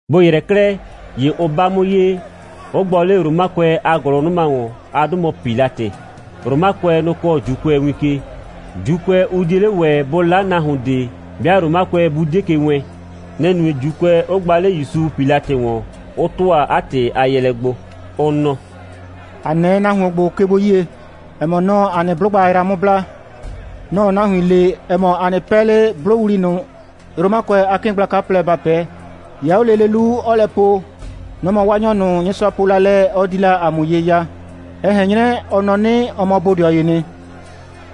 Bʋ ‑yrɛ 'klɛɛ, ‑ye ʋ 'ba 'mʋ ye, 'ʋ gbɔ 'le Romakʋɛ a ‑gʋlʋnʋma ‑wɔn. 'A 'dʋ mɔ Pilatɩ. (Romakʋɛ, nʋ‑ kɔɔ ‑Juukʋɛ win ke. ‑Juukʋɛ, ʋ 'die 'le ‑wɛ bʋ 'la nahuon ꞊de, 'bɩa Romakʋɛ 'bʋ 'die ke wɛɛn. Nɛ‑ nue, ‑Juukʋɛ 'ʋ gba 'le ‑Yusu Pilatɩ ‑wɔn,) 'ʋ ‑tʋa 'a ‑tɩ a yɛɛlɛ gbo, ʋ nɔ: «‑A 'nɛɛ nahuon ‑gbo ke gbo 'yie, ‑ɛ mɔ, nɔ‑ɔ ‑a nɩ 'blʋgba yra 'mʋ bla. Nɔ‑ɔ nahuin le, ‑ɛ mɔ, ‑a 'nɩ 'pɛɛ 'le 'blʋwli ꞊nʋ, Romakʋɛ a 'kɩɩn gblaka plɛ, ‑ba 'pɛɛ. 'Ya 'o lele 'lu, 'ɔɔ lɛ po, nɔ‑ mɔ Waanyɔ ꞊nʋ, Nyɩsʋa po la lɛ, ɔ di la ‑a mʋ ye ya, ɛ ꞊hɛn 'nyrɛ, ɔ nɔ 'nɩ, ɔ mɔ bodɩɔ ‑yee nɩ.»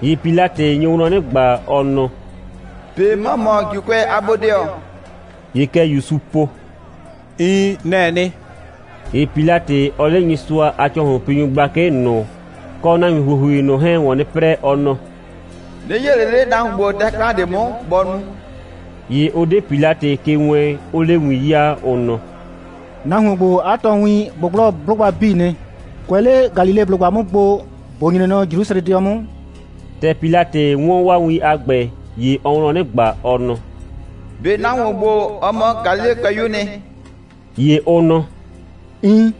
‑Ye Pilatɩ nyo wlɔn 'nɩ ꞊gba, ɔ nɔ: «꞊Be ‑mɔ mɔ ‑Juukʋɛ a bodɩɔ?» ‑Ye kɛ ‑Yusuu po: «Iin, nɛ‑ɛ nɩ.» ‑Ye Pilatɩ, ɔɔ 'le Nyɩsʋa a ‑cɔhlʋnpinyʋ gblakɩ ꞊nʋ kɔ nahuin ‑huohui ꞊nʋ 'hɛɛn ‑wɔn 'nɩ 'prɛɛ, ɔ nɔ: «'Nɩ 'yee ꞊le 'le nahuon ‑gbo dɛ 'klan ꞊de 'mʋ, bɔ nu.» ‑Ye ʋ 'de Pilatɩ ke wɛɛn, 'ʋʋ 'le win 'yaa, ʋ nɔ: «Nahuon ‑gbo, 'a tɔɔwin ꞊gbʋgblɔ 'blʋgba 'bii nɩ, kʋɛ 'le Galileblʋgba 'mʋ gbo, ‑bo nyre nɔ Jrusrɛdɩɔ 'mʋ.» ‑Tɛ Pilatɩ 'wɔn 'waa win a ‑gbɛ, ‑ye ɔɔ wlɔn 'nɩ ꞊gba, ɔ nɔ: «꞊Be nahuon ‑gbo, ɔ mɔ Galilekʋɛyu'u nɩ?» ‑Ye ʋ nɔ: «Iin.»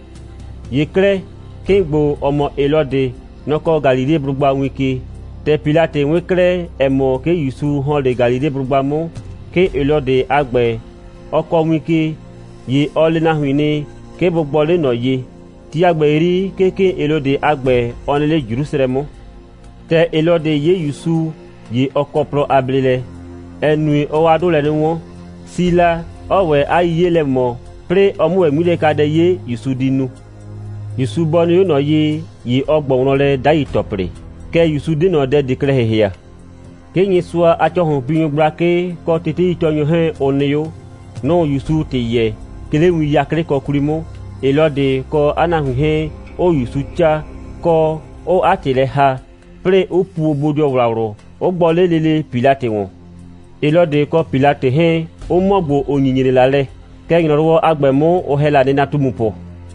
‑Ye 'klɛɛ, 'kɩɩn ‑gbo, ‑ɔ mɔ Helɔdɩ, nɔ‑ kɔɔ Galileblʋgba win ke. ‑Tɛ Pilatɩ 'wɩn 'klɛɛ, ‑ɛ mɔ, 'ke ‑Yusu ‑hɔn 'le Galileblʋgba 'mʋ, 'kɩɩn Helɔdɩ a ‑gbɛ, ɔ kɔɔ win ke, ‑ye ɔ le 'a nahuin nɩ, 'ke bʋ gbɔ 'le ꞊nɔ ye. Ti a ‑gbɛ 'yri, 'ke 'kɩɩn Helɔdɩ a ‑gbɛ, ɔ nɩ 'le Jrusrɛ 'mʋ. ‑Tɛ Helɔdɩ 'ye ‑Yusu, ‑ye ɔ kɔ plɔ a bleelɛ, ‑ɛ nue, ɔɔ 'a 'dʋ lɛ 'nɩ 'wɔn, si la, 'ɔɔ ‑wɛ 'a 'yiye lɛ ꞊mɔ, 'plɩɩ ɔ 'mʋ ‑wɛ 'ŋmilɛkadɛ 'ye, ‑Yusu di nu. ‑Yusu bɔ nɩ 'o ꞊nɔ ye, ‑ye ɔ ꞊gbɔ wlɔn lɛ 'dai ‑tɔplɩ. Kɛɛ, ‑Yusu 'de ꞊nɔ dɛ ꞊de klɛ ‑hɩhɩa. 'Ke Nyɩsʋa a ‑cɔhlʋnpinyʋ gblakɩ kɔ teteitɔɔnyʋ 'hɛɛn, ʋ nɩ 'o. Nʋ‑ʋ ‑Yusu ‑tɩ yɛɛ, 'ke 'le win 'yaklɩkɔ 'kwli 'mʋ, Helɔdɩ kɔ 'a nahuin 'hɛɛn, 'ʋʋ ‑Yusu 'caa, kɔ, 'ʋʋ 'a ‑tɩ lɛ ‑haa, 'plɩɩ 'ʋ puo bodɩɔwlawlʋ, 'ʋ gbɔ 'le lele Pilatɩ ‑wɔn. Helɔdɩ kɔ Pilatɩ 'hɛɛn, ʋ mɔ ‑gbo, ʋ nyinyre la lɛ, kɛɛ, ‑nyrɔwɔ a ‑gbɛ 'mʋ, ʋ ‑hɛ la nɩnatumupʋ.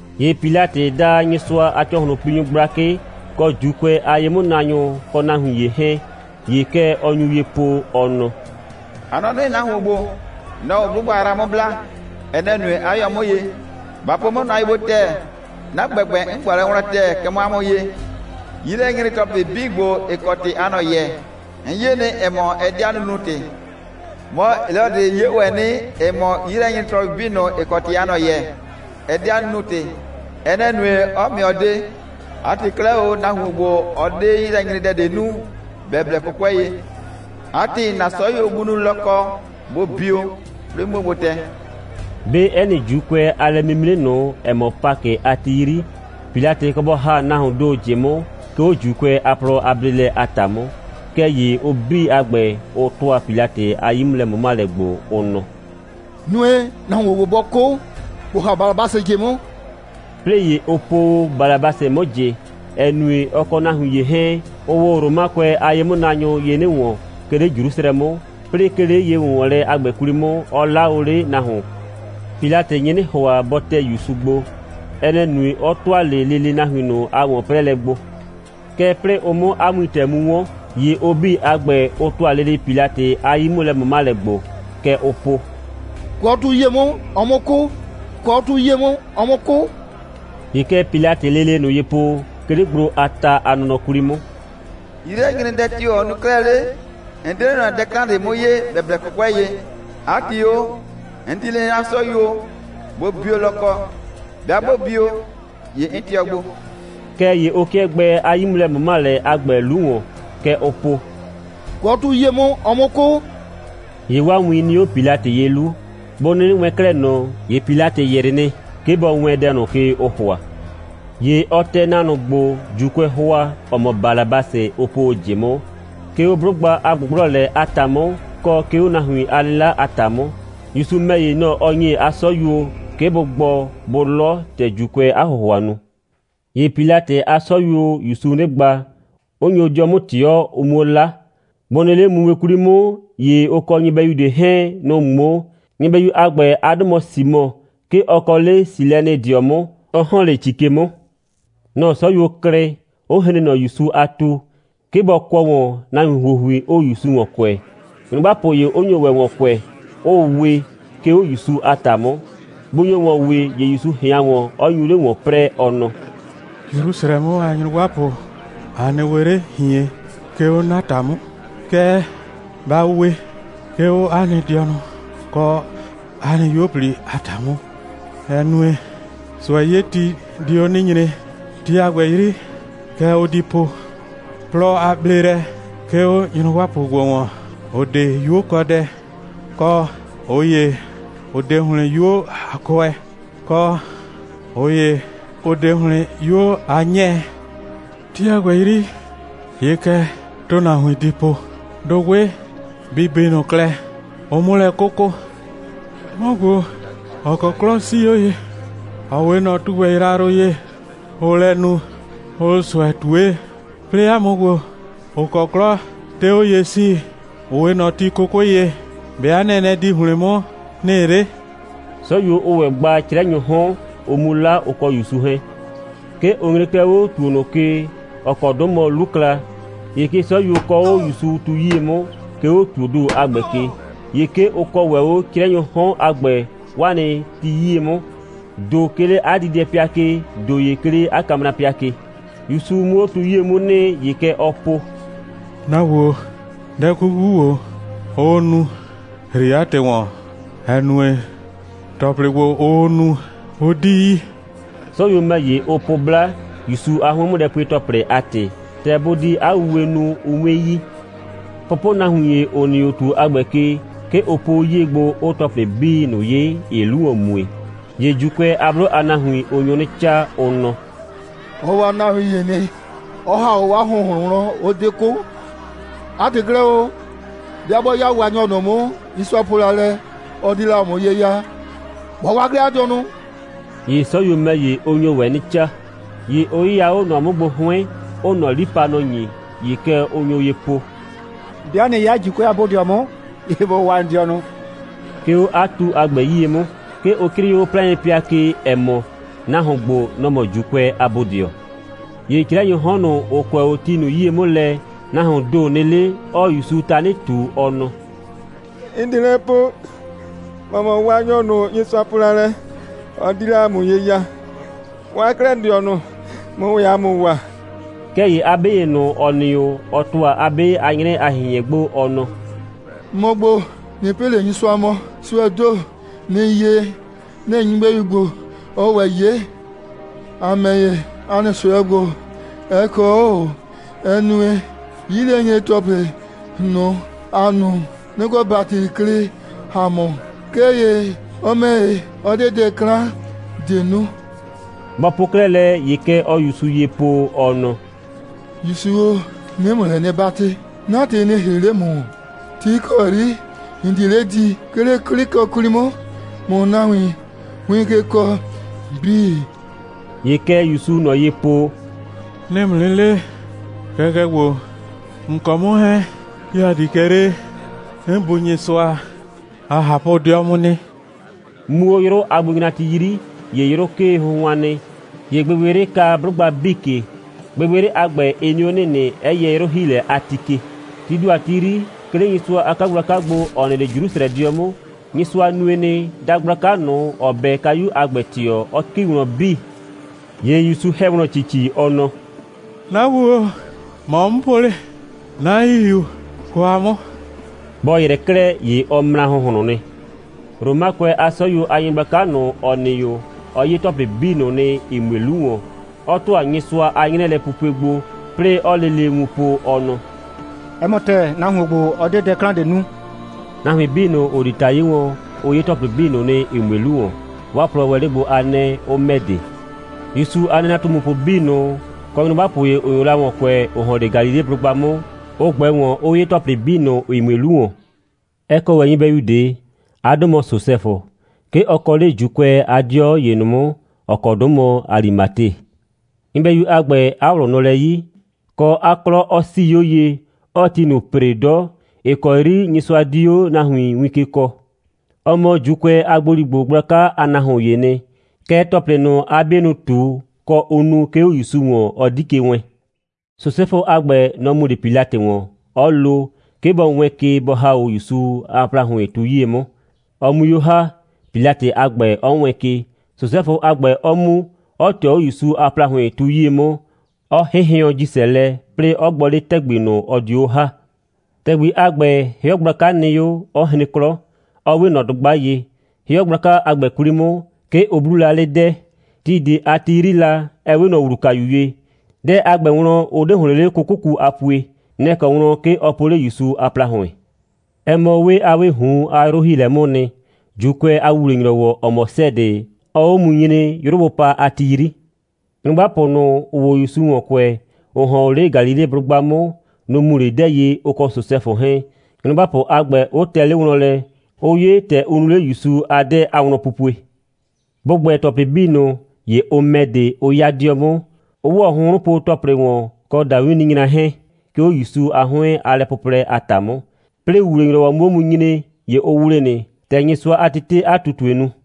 ‑Ye Pilatɩ da Nyɩsʋa a ‑cɔhlʋnpinyʋ gblakɩ, kɔ ‑Juukʋɛ a ye'mʋnaanyʋ kɔ nahuin ‑ye 'hɛɛn. ‑Ye kɛ ɔ nyu ye po, ɔ nɔ: «A nɔ 'nɩ, nahuon ‑gbo, nɔ‑ɔ 'blʋgba yra 'mʋ bla. Ɛ nɛ‑ nue, 'a yɔ 'mʋ ye. Ba po 'mʋ nʋa ye gbo ‑tɛɛ: 'Na ‑gbɛgbɛ, 'n ꞊gbɔ lɛ wlɔn ‑tɛɛ, kɛ mɔ 'a mʋ ye. 'Yilɛnyre‑tɔplɩ 'bii ‑gbo, ‑ɩ kɔ ‑tɩ aa ꞊nɔ yɛɛ, 'n 'ye nɩ, ‑ɛ mɔ, ɛ 'de 'a nunu‑tɩ. Mɔ, Helɔdɩ 'ye ‑wɛ nɩ, ‑ɛ mɔ, 'yilɛnyre‑tɔplɩ 'bii ꞊nʋ, ‑ɩ kɔ ‑tɩ aa ꞊nɔ yɛɛ, ɛ 'de 'a nunu‑tɩ. Ɛ nɛ‑ nue, 'ɔ ‑mɩɔ de. 'A ‑tɩ 'klɛɛ o, nahuon ‑gbo, ɔ 'de 'yilɛnyredɛ ꞊de nu, ‑bɛ blɛ 'kʋkʋɛ ye. 'A ‑tɩ, 'na 'sɔyuo bʋ nu lɔkɔ, bʋ bio, 'plɩɩ 'muo gbo tɛ.» [ 'Be 'ɛ nɩ ‑Juukʋɛ a lɛ'mimre ꞊nʋ, ‑ɔ mɔ Pakɩ a ti 'yri, Pilatɩ kɔ bɔ ‑ha nahuoon ‑do ꞊jɩ 'mʋ, 'ke 'o ‑Juukʋɛ a plɔ a bleelɛ a ‑ta 'mʋ.] Kɛɛ ‑ye ʋ 'bii a ‑gbɛ, ʋ ‑tʋa Pilatɩ a 'yi'mʋlɛ꞊mʋmalɛ gbo, ʋ nɔ: «Nue, nahuon ‑gbo bɔ 'kʋ, ‑bo ‑ha Balabasɩ ꞊jɩ 'mʋ.» 'Plɩɩ ‑ye ʋ po o Balabasɩ 'mʋ ꞊jɩ, ‑ɛ nue, ɔ kɔ nahuin ‑ye 'hɛɛn, ʋʋ o Romakʋɛ a ye'mʋnaanyʋ ye 'nɩ ‑wɔn, 'ke 'le Jrusrɛ 'mʋ, 'plɩɩ, 'ke 'le ye‑wʋnwɔnlɛ a ‑gbɛ 'kwli 'mʋ, ʋ 'laa o 'le nahuon. Pilatɩ nye 'nɩ ‑hʋa, bɔ tɛ ‑Yusu gbo. Ɛ nɛ‑ nue, 'ɔ ‑tʋa 'le lele nahuin ꞊nʋ a ‑wɔn'prɛɛlɛ gbo. Kɛɛ, 'plɩɩ ʋ 'mʋ 'a wintɛ mu 'wɔn, ‑ye ʋ 'bii a ‑gbɛ, ʋ ‑tʋa lele Pilatɩ a 'yi'mʋlɛ꞊mʋmalɛ gbo. Kɛ ʋʋ po: «Kʋɔ 'o tu 'yie 'mʋ, ɔ 'mʋ 'kʋ; kʋɔ 'o tu 'yie 'mʋ, ɔ 'mʋ 'kʋ.» ‑Ye kɛ Pilatɩɩ lele ꞊nʋ ye po, 'ke 'le gblo a ta a nɔnɔ 'kwli 'mʋ: «'Yilɛnyredɛ tio‑ ɔ nu 'klɛɛ 'le? 'N 'de 'le ꞊nɔ dɛ 'klan ꞊de 'mʋ 'yee, ‑bɛ blɛ 'kʋkʋɛ ye. 'A ‑tɩ o, 'n di le 'na 'sɔyuo, bʋ bio lɔkɔ. 'Bɩa 'bʋ bio, ‑ye 'n tɩɔ gbo.» Kɛɛ ‑ye ʋ 'kɩɛ gbɛɛ 'a 'yi'mʋlɛ꞊mʋmalɛ a ‑gbɛ 'lu ‑wɔn. Kɛ ʋʋ po: «Kʋɔ 'o tu 'yie 'mʋ, ɔ 'mʋ 'kʋ.» ‑Ye 'waa win nɩ 'o Pilatɩ ye 'lu. Bʋ 'nɩnɩ wɛɛn 'klɛɛ ꞊nɔ, ‑ye Pilatɩ ‑yrɩ nɩ, 'ke bɔ wɛɛn dɛ ꞊nʋ ke, ʋʋ ‑hʋa. ‑Ye ɔ tɛ nahuon ꞊nʋ gbo, ‑Juukʋɛɛ ‑hʋa, ‑ɔ mɔ Balabasɩ, ʋ po o ꞊jɩ 'mʋ, 'ke 'o 'blʋgba a ꞊gbʋgblɔlɛ a ‑ta 'mʋ, kɔ, 'ke 'o nahuon a 'lɩla a ‑ta 'mʋ. ‑Yusu ‑mɛ ‑ye, nɔ‑ ɔ ‑nye 'a 'sɔyuo, 'ke bʋ gbɔ, bʋ 'lɔ, ‑tɛ ‑Juukʋɛɛ 'a ‑hʋhʋa nu. ‑Ye Pilatɩ a 'sɔyuoo ‑Yusu 'nɩ gba, 'ʋ nyo 'dɩɔ 'mʋ ꞊tɩɔ, ʋ 'muo 'la. Bʋ nɩ 'le mumue 'kwli 'mʋ, ‑ye ʋ kɔ nyɩbɛyu ꞊de 'hɛɛn, nʋ‑ ꞊ŋmoo. Nyɩbɛyu a ‑gbɛ, 'a 'dʋ mɔ Simɔ. 'Ke ɔ kɔ 'le Silɛnɩdɩɔ 'mʋ, 'ɔ ‑hɔn 'le ‑ci ke 'mʋ. Nɔ‑ 'sɔyuo klɩ, 'ʋ hren ꞊nɔ ‑Yusu a tu, 'ke bɔ kʋɔ ‑wɔn, nahuin ‑huohui 'ʋʋ ‑Yusu ‑wɔn kʋɛ, nyrʋgbapʋ ‑ye 'ʋ nyo ‑wɛ ‑wɔn kʋɛ, 'ʋʋ we, 'ke 'o ‑Yusu a ‑ta 'mʋ. Bʋ nyo ‑wɔn wee, ‑ye ‑Yusu ꞊hɩan ‑wɔn, 'ɔ nyu 'le ‑wɔn 'prɛɛ, ɔ nɔ: «Jrusrɛ 'mʋ a nyrʋgbapʋ, a nɩ we 'le ꞊hien, 'ke 'o 'na ‑ta 'mʋ, kɛɛ, ba we, 'ke 'o 'a nɩ dɩɔnʋ kɔ 'a nɩ 'yuo꞊pli a ‑ta 'mʋ, ‑ɛ nue, ꞊sʋɛ'yeti di 'o 'nɩ nyre. Ti a ‑gbɛ 'yri, kɛ ʋ di po: Plɔ a bleelɛ 'ke 'o nyrʋgbapʋ ‑gbo ‑wɔn, ‑ʋ 'de 'yukɔdɛ, kɔ ꞊ʋ ‑ye, ‑ʋ 'de ‑hlɩn 'yuo a kʋɛ, kɔ ꞊ʋ ‑ye, ‑ʋ 'de ‑hlɩn 'yuo a 'nyɛɛ. Ti a ‑gbɛ 'yri, ‑ye kɛ ‑tʋnahuin di po, dʋgbɩ bɩ bi ꞊nʋ klɛ, ʋ 'mʋ lɛ 'kʋkʋ. 'Mɔ ‑gbo, ‑ɔ kɔ 'klɔ 'sii 'o ye, ‑ɔ 'we ꞊nɔ tugbɛ yrayrʋ ye, ʋʋ lɛ nu, ʋʋ ꞊sʋɛ ꞊tue, 'plɩɩ 'a mʋ ‑gbo, ‑ʋ kɔ 'klɔ 'de 'o ye 'sii, ‑ʋ 'we ꞊nɔ ti 'kʋkʋɩ ye, ‑be' 'a nɛnɛ di ‑hlɩn 'mʋ nɩ 'le?» 'Sɔyuo, ʋʋ ‑wɛ gba 'crɛnyʋʋ 'hɔn, ʋ 'mu 'la, ʋ kɔ ‑Yusu 'hɛɛn. 'Ke ʋ nyre 'klɛɛ 'o ‑tuo ꞊nʋ ke, ‑ɔ kɔ 'dʋ mɔ 'Lukla. ‑Ye 'ke 'sɔyuo kɔɔ 'o ‑Yusu tu 'yie 'mʋ, 'ke 'o ‑tuoo ‑do a ‑gbɛ ke. ‑Ye 'ke ʋ kɔɔ ‑wɛ 'o 'crɛnyʋʋ 'hɔn a ‑gbɛ 'waa nɩ ti 'yie 'mʋ, ‑do 'ke 'le 'a diidɛpɩa ke, ‑do ‑ye 'ke 'le 'a kamrapɩa ke. ‑Yusu 'mʋ 'o tu 'yie 'mʋ nɩ, ‑ye kɛ ɔɔ po: «'Na Bu o, dɛ 'kuku ‑gbo, ʋʋ nu, ‑hri 'a ‑tɩ ‑wɔn, ‑ɛ nue, ‑tɔplɩ ‑gbo, ʋʋ nu, ʋ 'di yi.» 'Sɔyuo ‑mɛ ‑ye, ʋ po 'bla, ‑Yusu a 'hʋɩn'mʋlɛpue‑tɔplɩ a ‑tɩ, ‑tɛ bʋ di 'a wuwe nu, ʋ 'mue yi. Pʋpʋnahuin ‑ye, ‑ʋ nɩ 'o ‑tuo a ‑gbɛ ke, 'ke ʋ po 'o 'yie gbo, 'ʋʋ ‑tɔplɩ 'bii ꞊nʋ 'ye, ‑ɩɩ 'lu ‑wɔn mue. ‑Ye ‑Juukʋɛ a 'blʋ a nahuin, ʋ nyo 'nɩ 'caa, ʋ nɔ: «Ɔ waa nahuin ‑ye nɩ, 'ɔ ‑ha 'o 'waa ‑hʋnhlʋn wlɔn, 'ʋ 'de 'kʋ. 'A ‑tɩ 'klɛɛ o, 'bɩa 'bɔ 'ya Waanyɔ ꞊nʋ 'mʋ, Nyɩsʋa po la lɛ, ɔ di la ‑a mʋ ye ya, bɔ waa 'klɛɛ 'a dɩɔnʋ!» ‑Ye 'sɔyuo ‑mɛ ‑ye, ʋ nyo ‑wɛ 'nɩ 'caa. ‑Ye ʋ 'yɩya 'o ꞊nɔ 'mʋ gbo 'hʋɩn, 'ʋʋ ꞊nɔ 'lipanɔ ‑nye. ‑Ye kɛ ʋ nyo ye po: «'Bɩa ꞊nɩ 'ya ‑Juukʋɛ a bodɩɔ 'mʋ, ‑ye ‑bo waa ‑n dɩɔnʋ!» 'Ke 'o 'a tu a ‑gbɛ 'yie 'mʋ, 'ke ʋ 'crɩɩ 'o 'plaɩnpɩa ke, ‑ɛ mɔ: «Nahuon ‑gbo, nɔ‑ mɔ ‑Juukʋɛ a bodɩɔ.» ‑Ye 'crɛnyʋʋ 'hɔn ꞊nʋ, ‑ʋ kʋɛ 'o ti ꞊nʋ 'yie 'mʋ lɛ, nahuoon ‑do nɩ 'le, 'ɔɔ ‑Yusu tanɩ ꞊tu, ɔ nɔ: «‑N 'de lɛ po, ‑mɔ mɔ Waanyɔ ꞊nʋ, Nyɩsʋa po la lɛ, ɔ di la ‑a mʋ ye ya. Waa 'klɛɛ ‑n dɩɔnʋ, ꞊mʋ ‑wɛ ‑a mʋ waa.» Kɛɛ ‑ye 'a 'be ‑ye ꞊nʋ, ‑ɔ nɩ 'o, ɔ ‑tʋa 'a 'be a 'nyrɛ a ꞊hɩnhɩɛn gbo, ɔ nɔ: «‑Mɔ ‑gbo, ꞊nɩ pɩ ꞊le Nyɩsʋa mɔ. ꞊Sʋɛɛ ‑do, ‑nɩɩ 'ye, nɛ‑ nyɩbɛyu ‑gbo, ɔɔ ‑wɛ 'ye. ‑A ‑mɛ ‑ye, ‑a nɩ ꞊sʋɛ ‑gbo, ɛ kɔ 'o ꞊o, ‑ɛ nue, 'yilɛnyre‑tɔplɩ ꞊nʋ, ‑a nu, nɩ‑ kɔ ‑bati klɩ ‑a mʋ. Kɛɛ ‑ye ɔ ‑mɛ ‑ye, ɔ 'de dɛ 'klan ꞊de nu.» Bɔ po 'klɛɛ lɛ, ‑ye kɛ ɔɔ ‑Yusu ye po, ɔ nɔ: «‑Yusu o, 'nɩɩ ‑mʋ lɛ 'nɩ 'batɩ, 'na ‑tɩ nɩ ‑hri 'le ‑mʋ ‑wɔn, ti ‑kɔ 'yri ‑n di 'le di, 'ke 'le 'klɩkɔ 'kwli 'mʋ, ꞊mʋ nahuin win ke kɔɔ 'bii.» ‑Ye kɛ ‑Yusuu ꞊nɔ ye po: «'Nɩɩ ‑mʋ 'nɩ le, kɛkɛ ‑gbo, ‑n kɔ 'mʋ 'hɛɛn, 'ke ‑a di kɛ 'le 'n Bu Nyɩsʋa a ꞊hapʋ'dɩɔ 'mʋ nɩ.» Muu 'o 'yrʋ a gbonyrati 'yri, ‑ye 'yrʋ 'kee hʋnhʋan nɩ. ‑Ye gbɩgbɩyrɩ ka 'blʋgba 'bii ke. Gbɩgbɩyrɩ a ‑gbɛ, ɩ nɩ 'o ‑nɩnɩ, 'ɛ yɛ 'yrʋ‑hiilɛ a ti ke. Tii ‑do a ti 'yri, 'ke 'le Nyɩsʋa a 'kagblaka gbo, ‑ɔ nɩ 'le Jrusrɛdɩɔ 'mʋ, Nyɩsʋa nue nɩ, dagblaka ꞊nʋ, ‑ɔ 'bɛ kayu a ‑gbɛ ꞊tɩɔ, 'ɔ ‑ki wlɔn 'bii. ‑Ye ‑Yusu ‑hɛ wlɔn ‑cici, ɔ nɔ: «'Na Bu, ‑mɔ 'n po 'le 'na ‑hihiu kwa 'mʋ.» Bɔ ‑yrɛ 'klɛɛ, ‑ye ɔ mra ‑hʋnhlʋn nɩ. Romakʋɛ a 'sɔyuo a nyɩgblaka ꞊nʋ, ‑ɔ nɩ 'o, ɔ 'ye ‑tɔplɩ 'bii ꞊nʋ nɩ, ‑ɩ mue 'lu ‑wɔn, 'ɔ ‑tʋa Nyɩsʋa a 'nyrɛɛlɛpupue gbo, 'plɩɩ 'ɔɔ lele wun po, ɔ nɔ: «'Ɛ mɔ ‑tɛɛ, nahuon ‑gbo, ɔ 'de dɛ 'klan ꞊de nu.» Nahuin 'bii ꞊nʋ, ‑ʋ di ‑ta 'ye wɔn, ʋ 'ye ‑tɔplɩ ꞊nʋ nɩ, ‑ɩ mue 'lu ‑wɔn. 'Waa plɔɔ 'le gbo a 'nɛɛ, 'ʋ ‑mɛ de. ‑Yusu a nɩnatumupʋ 'bii ꞊nʋ, kɔ nyrʋgbapʋ ‑ye, ‑ʋ nyo la ‑wɔn kʋɛ, ‑ʋ ‑hɔn 'le Galileblʋgba 'mʋ, ʋ ꞊gbɛ ‑wɔn, 'ʋ 'ye ‑tɔplɩ 'bii ꞊nʋ, ‑ɩ mue 'lu ‑wɔn. Ɛ kɔ ‑wɛ nyɩbɛyu ꞊de. 'A 'dʋ mɔ Sosɛfʋ. 'Ke ɔ kɔ 'le ‑Juukʋɛ a 'dɩɔ ‑ye ꞊nʋ 'mʋ, ‑ɔ kɔ 'dʋ mɔ Alimate. Nyɩbɛyu a ‑gbɛ, 'a ꞊wlʋ nɔ lɛ 'yi, kɔ, 'a 'klɔ 'ɔ 'sii 'o ye, 'ɔɔ ti ꞊nʋ ‑pre 'dɔ, ‑ɩ kɔ 'yri Nyɩsʋa di 'o nahuin win ke kɔɔ. Ɔ mɔ ‑Juukʋɛ a ‑gboligbo gblaka a nahuoon ‑yee nɩ. Kɛɛ, ‑tɔplɩ ꞊nʋ, 'a 'bienʋ ꞊tu, kɔ, ʋ nu, 'ke 'o ‑Yusu ‑wɔn, ɔ 'di ke wɛɛn. Sosɛfʋ a ‑gbɛ, nɔ‑ mu 'le Pilatɩ ‑wɔn, 'ɔ lo, 'ke bɔ wɛɛn ke, bɔ ‑ha 'o ‑Yusu a ‑plahʋɩn tu 'yie 'mʋ, ɔ 'mui 'o ‑ha, Pilatɩ a ‑gbɛ 'ɔ wɛɛn ke, Sosɛfʋ a ‑gbɛ 'ɔ mu, 'ɔ ꞊tɩɔ 'o ‑Yusu a ‑plahʋɩn tu 'yie 'mʋ, 'ɔ 'hɩnhɩʋɔn ‑jisɛ lɛ, 'plɩɩ 'ɔ gbɔ 'le ‑tɛgbi ꞊nʋ, ɔ dio 'o ‑ha. ‑Tɛgbi a ‑gbɛ, 'hɩɔ gblaka nɩ 'o, 'ɔ hren 'klɔ, 'ɔ 'we ꞊nɔ dʋgba ye. 'Hɩɔ gblaka a ‑gbɛ 'kwli 'mʋ, 'ke ʋ 'bluu la 'le 'dɛɛ, (ti ꞊de a ti 'yri la, ‑ɛ 'we ꞊nɔ ‑wlukayu ye). 'Dɛɛ a ‑gbɛ wlɔn, ʋ 'de ‑hlɩn 'le 'kʋkʋku a pue. Nɛ‑ kɔ wlɔn, 'ke ɔ po 'le ‑Yusu a ‑plahʋɩn. Ɛ mɔ 'wee a 'wɩɩ ꞊hun a 'yrʋ‑hiilɛ 'mʋʋ nɩ, ‑Juukʋɛ a ‑wuwle‑nyrɔwɔ, ‑ɔ mɔ 'sɛɛdɩ, 'ɔɔ 'o mu nyre, 'yrʋ bʋ pa a ti 'yri. Nyrʋgbapʋ ꞊nʋ, ‑ʋʋ o ‑Yusu ‑wɔn kʋɛ, ‑ʋ ‑hɔn o 'le Galileblʋgba 'mʋ, nʋ‑ mu 'le 'dɛɛ ye, ʋ kɔ Sosɛfʋ 'hɛɛn, nyrʋgbapʋ a ‑gbɛ 'ʋ tɛ 'le wlɔn lɛ, 'ʋ 'ye, ‑tɛ ʋ nu 'le ‑Yusu a 'dɛɛ a wlɔnpupue. Bʋ ‑gbɛ ‑tɔplɩ 'bii ꞊nʋ, ‑ye ʋ ‑mɛ de, 'ʋ 'ya 'dɩɔ 'mʋ, 'ʋ ‑wɔ hʋnhrʋnpo‑tɔplɩ ‑wɔn, kɔ ‑dawinninyra 'hɛɛn, 'ke 'o ‑Yusu a 'hʋɩn a lɛplʋʋlɛ a ‑ta 'mʋ. 'Plɩɩ ‑wuwle‑nyrɔwɔ 'mʋ 'o mu nyre, ‑ye ʋ ‑wle nɩ, ‑tɛ Nyɩsʋa a tetee 'a ꞊tutue nu.